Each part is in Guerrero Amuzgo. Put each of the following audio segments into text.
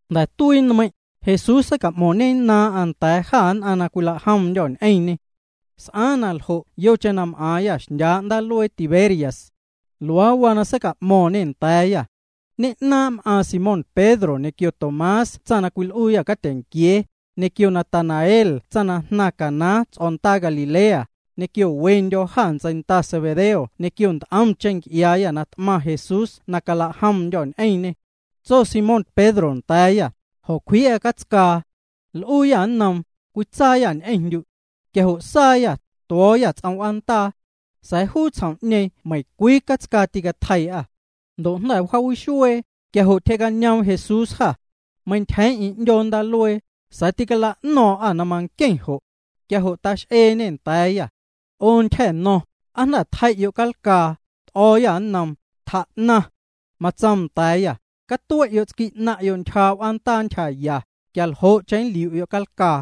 Jnda̱ tuii nmeiⁿ', Jesús seica'mo̱ⁿñennaaⁿ'aⁿ nda̱a̱ jâ nn'aⁿ na cwilajomndyô̱ ñ'eⁿñê. S'aaⁿ na ljo' yocheⁿ na m'aaⁿyâ xndyaa' ndaaluee Tiberias. Luaa waa na seica'mo̱ⁿñê nda̱a̱yâ. Ñe'naaⁿ' m'aaⁿ Simón Pedro ñequio Tomás tsaⁿ na cwil'uuyâ catyeⁿnquiee, ñequio Natanael na jnaⁿ Caná ts'o̱ndaa Galilea, ñequio wendyô̱ jâ ntseinda Zebedeo ñequio nt'omcheⁿ nc'iaayâ na t'maⁿ Jesús na cala'jomndyô̱ ñ'eⁿñê. Tso Simón Pedro nda̱a̱yâ: Jo̱cwjii'a catscaa. L'uuyâ nnoom: —Cwitsaayâ ñ'eⁿndyu'. Quia jo' saayâ, tuo̱o̱yâ ts'om w'aandaa. Sa̱a̱ juu tsjom'ñeeⁿ meiⁿcwii catscaa tîcatjeii'â. Ndo' jnda̱ wjaawixuee, quia jo' tyjee'cañoom Jesús jâ. Meintyjeeⁿ'eⁿ 'ndyoo ndaaluee, sa̱a̱ tîcala'no̱o̱ⁿ'â na manqueⁿ jo'. Quia jo' tax'eeñê nda̱a̱yâ: —'O tyja̱no̱ⁿ, ¿aa jnda̱ tjei'yo' calcaa? T'o̱o̱yâ nnoom: —Tjaa'naⁿ. Matsoom nda̱a̱yâ: —Catue'yo' tsqui' 'naⁿ'yo' ntyjaa' w'aandaa ntyjaya, quia ljo'cheⁿ nliu'yo' calcaa.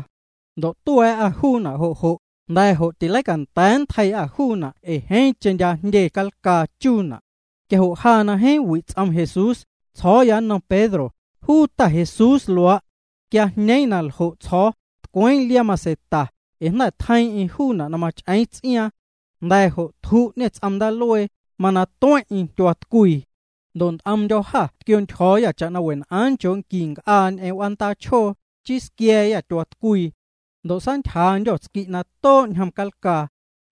Ndo' tua̱a̱'â juuna' jo' jo', jnda̱ jo' tileicanda̱a̱ nntjeii'â juuna' cwe' ee jeeⁿcheⁿ ndya' jndye calcaa chuuna'. Quia jo' ja na jeeⁿ wi' ts'om Jesús, tsjo̱o̱ya nnom Pedro: —Juu Ta Jesús luaa'. Quia jñeeⁿ na ljo' tsjo̱o̱, tcweeⁿ liaa maseta, ee jnda̱ tjeiiⁿ'eⁿ juuna' na mach'eeⁿ ts'iaaⁿ. Jnda̱ jo' tju'ñê ts'om ndaaluee, mana tueⁿ'eⁿ tyuaatcwii. Ndo' nt'omndyô̱ jâ tquio̱ntyjo̱o̱yâ cha'na wen'aaⁿ nchoo' nqui nc'aa ñ'eⁿ w'aandaa chjoo, chii squia̱a̱yâ tyuaatcwii. Ndo' saantyjaandyô̱ tsqui' na too' ñjom calcaa.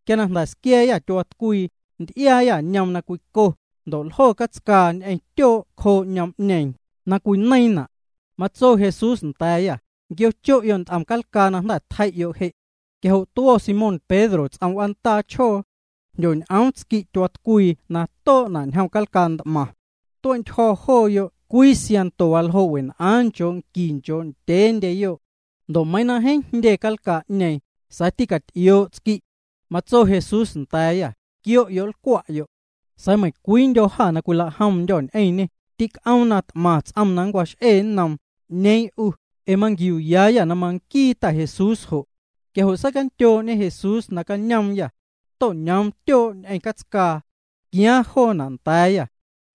Quia na jnda̱ squia̱a̱yâ tyuaatcwii, nty'iaayâ ñoom na cwico, ndo' ljo catscaa ñ'eⁿ tyoo' cjoo ñoom'ñeeⁿ, cwineiiⁿna'. Matso Jesús nda̱a̱yâ: —Quiocho'yo' nt'om calcaa na jnda̱ tjei'yo' je'. Quia jo' tuo̱ Simón Pedro ts'om w'aandaa chjoo. Jndyoñ'oom tsqui' tyuaatcwii na too'na' ñjom calcaa nt'maⁿ. Tue'ntyjo̱ jooyoo' cwii siaⁿnto waljoo' wen'aaⁿ nchoo' nqui nchoo' ndyeeyo'. Ndo' meiiⁿ na jeeⁿ ndya' jndye calcaa'ñeeⁿ, sa̱a̱ tîcaty'ioo' tsqui'. Matso Jesús nda̱a̱yâ: —Quio'yo' nlcwa'yo'. Sa̱a̱ meiⁿcwiindyô̱ jâ na cwilajomndyô̱ ñ'eⁿñê, tic'oom na t'maⁿ ts'om na nncwax'ee nnoom, ¿'Ñeeⁿ 'u? Ee manquiuuyaayâ na manquii Ta Jesús jo'. Quia jo' seicandyoo'ñe Jesús nacañoomyâ. To'ñoom tyoo' ñ'eⁿ catscaa. Tquiaaⁿ joona' nda̱a̱yâ.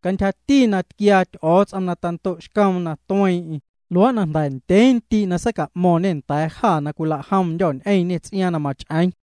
Cantyjati na tquiaa Ty'o̱o̱ts'om na tando'xcoom na tueeⁿ'eⁿ, luaa' jnda̱ ndyee ndii' na seica'mo̱ⁿñê nda̱a̱ jâ na cwilajomndyô̱ ñ'eⁿñê ts'iaaⁿ na mach'eeⁿ.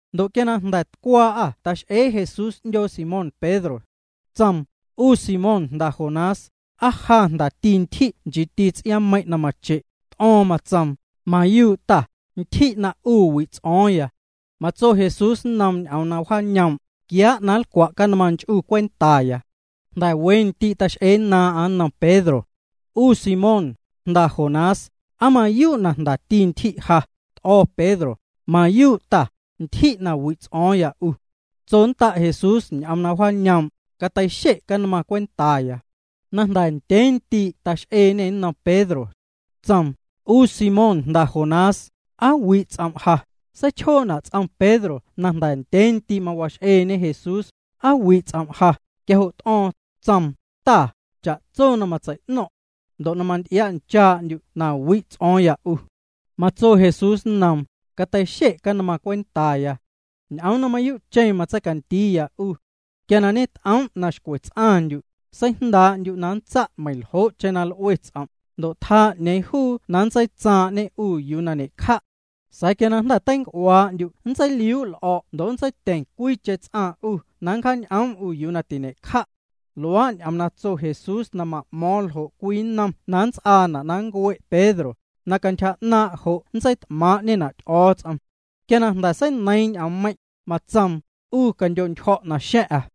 Ndo' quia na jnda̱ tcwaa'â tax'ee Jesús 'ndyoo Simón Pedro. Tsoom: —'U Simón jnda Jonás, ¿aa ja jndati ntyji' nchiiti ts'iaaⁿmeiⁿ' na mache'? T'o̱o̱ⁿ, matsoom: —Mayuu' Ta, ntyji' na 'u wi' ts'o̱o̱ⁿya. Matso Jesús nnoom ñ'oom na wjaañoom': —Quiaa' na nlcwa' canmaⁿ nch'u cwentaya. Jnda̱ we ndii' tax'eennaaⁿ'aⁿ nnom Pedro: —'U Simón, jnda Jonás, ¿aa mayuu' na jndati ntyji' ja? T'o̱ Pedro: —Mayuu' Ta, ntyji' na wi' ts'o̱o̱ⁿya 'u. Tsonnda' Jesús ñ'oom na wjaañoom': —Cateixe' canmaⁿ cwentaya. Na jnda̱ ndyee ndii' tax'eeñê nnom Pedro. Tsoom: —'U Simón, jnda Jonás, ¿aa wi' ts'om' ja? Seichjoo'na' ts'om Pedro na jnda̱ ndyee ndii' mawax'eeñe Jesús: “¿Aa wi' ts'om' ja?” Quia jo' t'o̱o̱ⁿ, tsoom: —Ta, cha'tso matsei'no̱ⁿ'. Ndo' manty'ia'nchaa'ndyu' na wi' ts'o̱o̱ⁿya 'u. Matso Jesús nnoom: —Cateixe' canmaⁿ cwentaya. Ñ'oom na mayuu'cheⁿ matseicandiiya 'u. Quia ñet'oom' na xcwe ts'aⁿndyu', seijndaa'ndyu' na nntsa' meiⁿljo'cheⁿ na l'ue ts'om', ndo' tjaa 'ñeeⁿ juu na nntseitsaaⁿ'ñe 'u yuu na ñe'cja'. Sa̱a̱ quia na jnda̱ teinc'uaa'ndyu' nntseiliuu' l'o̱' ndo' nntseityeⁿ cwiicheⁿ ts'aⁿ 'u na nncjaañ'oom 'u yuu na tiñe'cja'. Luaa' ñ'oom na tso Jesús na ma'mo̱o̱ⁿ ljo' cwii nnom na nnts'aana' na nncue' Pedro, na cantyja 'naaⁿ' jo' nntseit'maaⁿ'ñena' Ty'o̱o̱ts'om. Quia na jnda̱ seineiiⁿ ñ'oommeiⁿ', matsoom: —'U candyo'ntyjo̱' naxa̱ⁿ'a.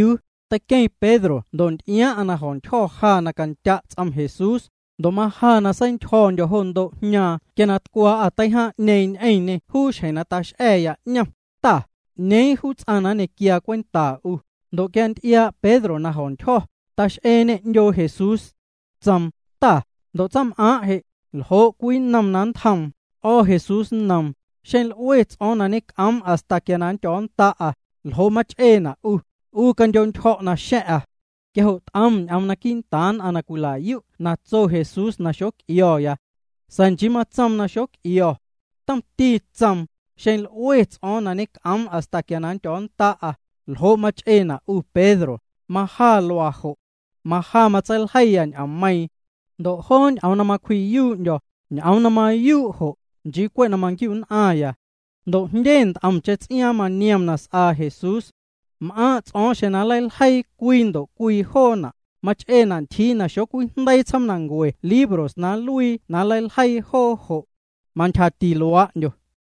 Teiqueⁿ Pedro ndo' nty'iaaⁿ'aⁿ na jo̱ntyjo̱ ja na candya' ts'om Jesús ja, ndo' maja na seintyjo̱ndyo̱ jo ndo' jñaaⁿ quia na tcwaa'â teijaaⁿ'ñeeⁿ ñ'eⁿñê juu xjeⁿ na tax'a̱ya 'ñom: “Ta, ¿'ñeeⁿ juu ts'aⁿ na nñequiaa cwenta 'u?” Ndo' quia nty'iaa' Pedro na jo̱ntyjo̱, tax'eeñê 'ndyoo Jesús. Tsoom: —Ta, ndo' tsaⁿm'aaⁿ' je', ¿ljo' cwii nnom na nntjoom? T'o̱ Jesús nnoom: —Xeⁿ l'ue ts'o̱o̱ⁿ na ñec'oom hasta quia nndyo̱o̱nnda'a, ¿ljo' mach'eena' 'u? 'U candyo'ntyjo̱' naxa̱ⁿ'a. Quia jo' t'om ñ'oom quii'ntaaⁿ nn'aⁿ na cwila'yu' na tso Jesús na xoc'io̱ya. Sa̱a̱ nchii matsoom na xoc'io̱. Tomti tsoom: “Xeⁿ l'ue ts'o̱o̱ⁿ na ñec'oom hasta quia nndyo̱o̱nnda'a, ¿ljo' mach'eena' 'u, Pedro?” Maja luaa jo'. Maja matseiljeiya ñ'oommeiⁿ'. Ndo' joo ñ'oom na macwji'yuu'ndyo̱, ñ'oom na mayuu' jo', nchii cwe' na maquiu'nn'aⁿya. Ndo' jndye nt'omcheⁿ ts'iaaⁿ maniom na s'aa Jesús. M'aaⁿ' ts'o̱o̱ⁿ xeⁿ nleiljeii cwii ndo' cwii joona', mach'eena' ntyjii na xocwijndeii tsjoomnancue libros na nluii na nleiljeii joo jo'. Mantyjati luaa'ndyo.